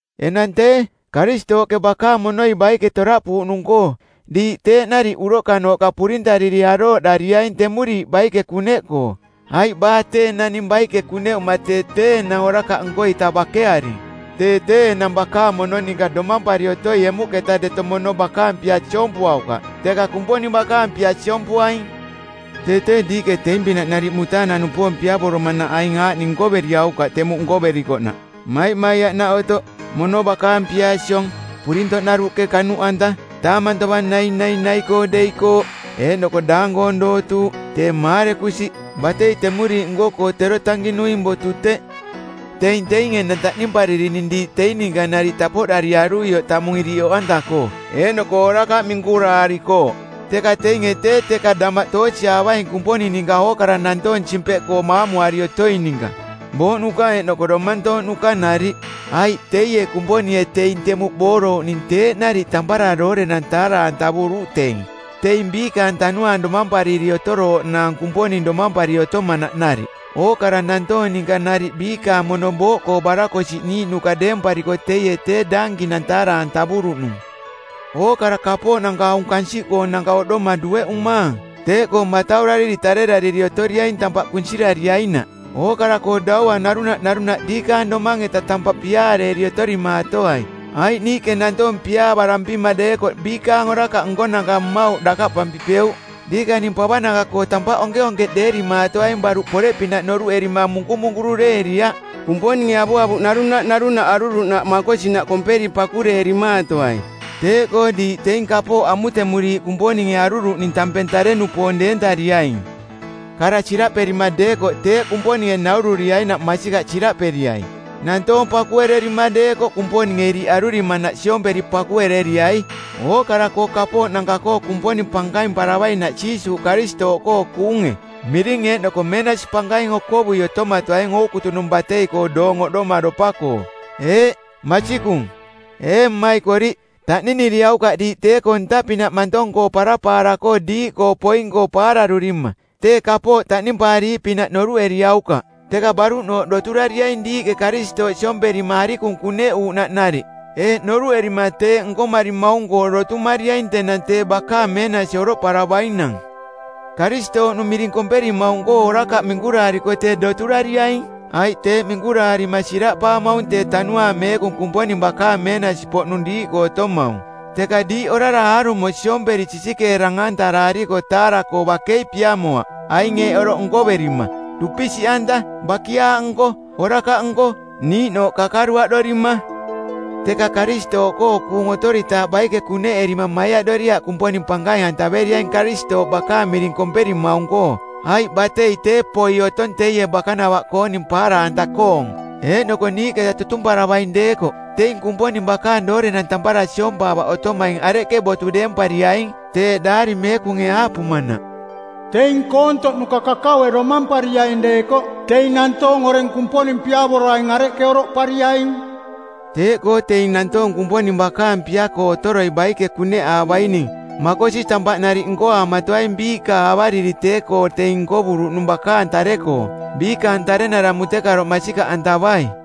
Enang tee, Karistooꞌke bakaang monoi baike toraꞌpuuꞌnung-koo diiꞌ teeꞌ nariꞌ uroꞌkanooꞌka purintariri arooꞌdariaing temuriiꞌ baike kuneꞌkoo, aiꞌ baa tee naning baike kuneꞌuma tee tee enang orakaꞌ nko-ita bakearing. Tee tee enang bakaang mono ninka domampari otoi emuꞌketa deto mono bakaang pia siompuaukaꞌ, teka Kumponing bakaang pia siompuaing. Tee tee diiꞌke teing-pinaꞌ nariꞌ mutaanang-nupoong piavoromanaꞌ aing aaꞌning nkoveriaukaꞌ temuꞌ nkoverikoꞌnaꞌ: maimaiaꞌnaꞌ otoꞌ, mono bakaang pia siong, purintoꞌ naruꞌke kanuꞌanta, taamang tovang nainai nai-koo deikooꞌ, eeꞌnoko daang-koong dootuuꞌ, tee maarekusiꞌ. Batei temuriiꞌ nko-koo tero tankinuing botu teꞌ. Teing teing enang taꞌnimparirining diiꞌ teing ninka nariꞌ tapoꞌdariaruioꞌ tamung iriꞌ oꞌanta-koo, eeꞌnoko orakaꞌ minkuraarikooꞌ. Teka teinge tee teka damaꞌ toosiaavaing Kumponing ninka ookara nantoong simpeꞌkoo maamuari otoing ninka: booꞌnuka eeꞌnoko domantooꞌnuka nariꞌ. Aiꞌ teie Kumponinge teing temuꞌ boorouꞌning teeꞌ nariꞌ tampara doorenang taara-antavuruꞌ teing teing biikaang tanuaang domampariri otorooꞌnaang Kumponing domampari otomanaꞌ nariꞌ. Ookara nantoong ninka nariꞌ biikaang mono booꞌkoo barakosiꞌniiꞌnuka deempariko teie tee daankinang taara-antavuruꞌnung. Ookara kapooꞌnanka aung kansiꞌkoonanka oꞌdoma dueꞌumaang. Teeꞌkoo mataurariri tarerariri otoriaing tampaꞌ kunsirariainaꞌ. Ookara-koo daua narunaꞌ narunaꞌ diikaang domang-eta tampaꞌ piaareeri otorimaatoai, aiꞌ niiꞌke nantoong piaavarampima deekoꞌ biikaang orakaꞌ nkonanka mmauꞌ dakaꞌpampipeuꞌ. Diikaning pavananka-koo tampaꞌ onkeonkeꞌdeerimaatoaing baruꞌ poreꞌpinaꞌ noruꞌerima munkumunkureeriaꞌ. Kumponinge avuavuꞌ narunaꞌ narunaꞌ aruruꞌnaꞌ makosinaꞌ komperi pakureerimaatoai. Teeꞌkoo diiꞌ teing kapooꞌ amutemuriiꞌ Kumponinge aruruꞌning tampeng tare-nupoong deentariaing. Kara siraꞌperima deekoꞌ teeꞌ Kumponinge naururiainaꞌ masikaꞌ siraꞌperiai. Nantoong pakuererima deekoꞌ Kumponinge iriꞌ arurimanaꞌ siomperi pakuereriai, ookara-koo kapooꞌ nanka-koo Kumponing pankaimparavainaꞌ Jiisuuꞌ Karistooꞌkoo kuunge. Miring eeꞌnoko meenasi pankaing okovui otomatoaing ookutunung batei-koo oꞌdomaropa-koo. Eeꞌ, masikung. Ee maikoriꞌ, taꞌniniriaukaꞌ diiꞌ tee-koo ntaꞌpinaꞌ mantong-koo parapaara-koo diiꞌkoo poing-koo paararurima. Tee kapooꞌ taꞌnimpaariiꞌpinaꞌ noruꞌeriaukaꞌ. Teka baruꞌnooꞌ doturariaing diiꞌke Karistooꞌ siomperima arikung kuneꞌuuꞌnaꞌ nariꞌ, eeꞌ noruꞌerima teeꞌ nkomarimaung-koo dotumariaing tenang tee bakaang meenasi oroꞌparavainang. Karistooꞌnung miring komperimaung-koo orakaꞌ minkuraariko tee doturariaing, aiꞌ teeꞌ minkuraarima siraꞌpaamaung tee Tanuaang Meekung Kumponing bakaang meenasi-poꞌnung diiꞌkoo otomaung. Teka diiꞌ orara aarumo siomperi sisikeerang-antarariko taara-koo bakei piamoaꞌ aing eeꞌ oroꞌ nkoverima: dupisiꞌanta, bakiaaꞌnko, orakaꞌnko, niiꞌnooꞌ kakaruaꞌdorima. Teka Karistooꞌkoo kuung otoritaaꞌ baike kuneꞌerima maiaꞌdoriaꞌ Kumponing pankaing-antaveriaing Karistooꞌ bakaang miring komperimaung-koo. Aiꞌ batei tee poi otong teie bakanavaꞌkooning paara-anta-koong. Eeꞌnoko niiꞌketa tutumparavaing deekoꞌ teing Kumponing bakaang doorenang tampara siompaavaꞌ otomaing areꞌke botu deempariaing? Teeꞌ Daari Meekunge aaꞌpumanaꞌ, “Teing koontoꞌnuka kakaue domampariaing deekoꞌ, teing nantoong oreng Kumponing piavoroaing areꞌke oroꞌpariaing?” Teeꞌkoo teing nantoong Kumponing bakaang pia-koo otoroi baike kuneꞌaavaining, makosi tampaꞌ nariꞌ nkoaamatoaing biiꞌka avariri tee-koo teing nkovuruꞌnung bakaang tare-koo, biikaang tarenara mutekaroꞌ masikaꞌantavai.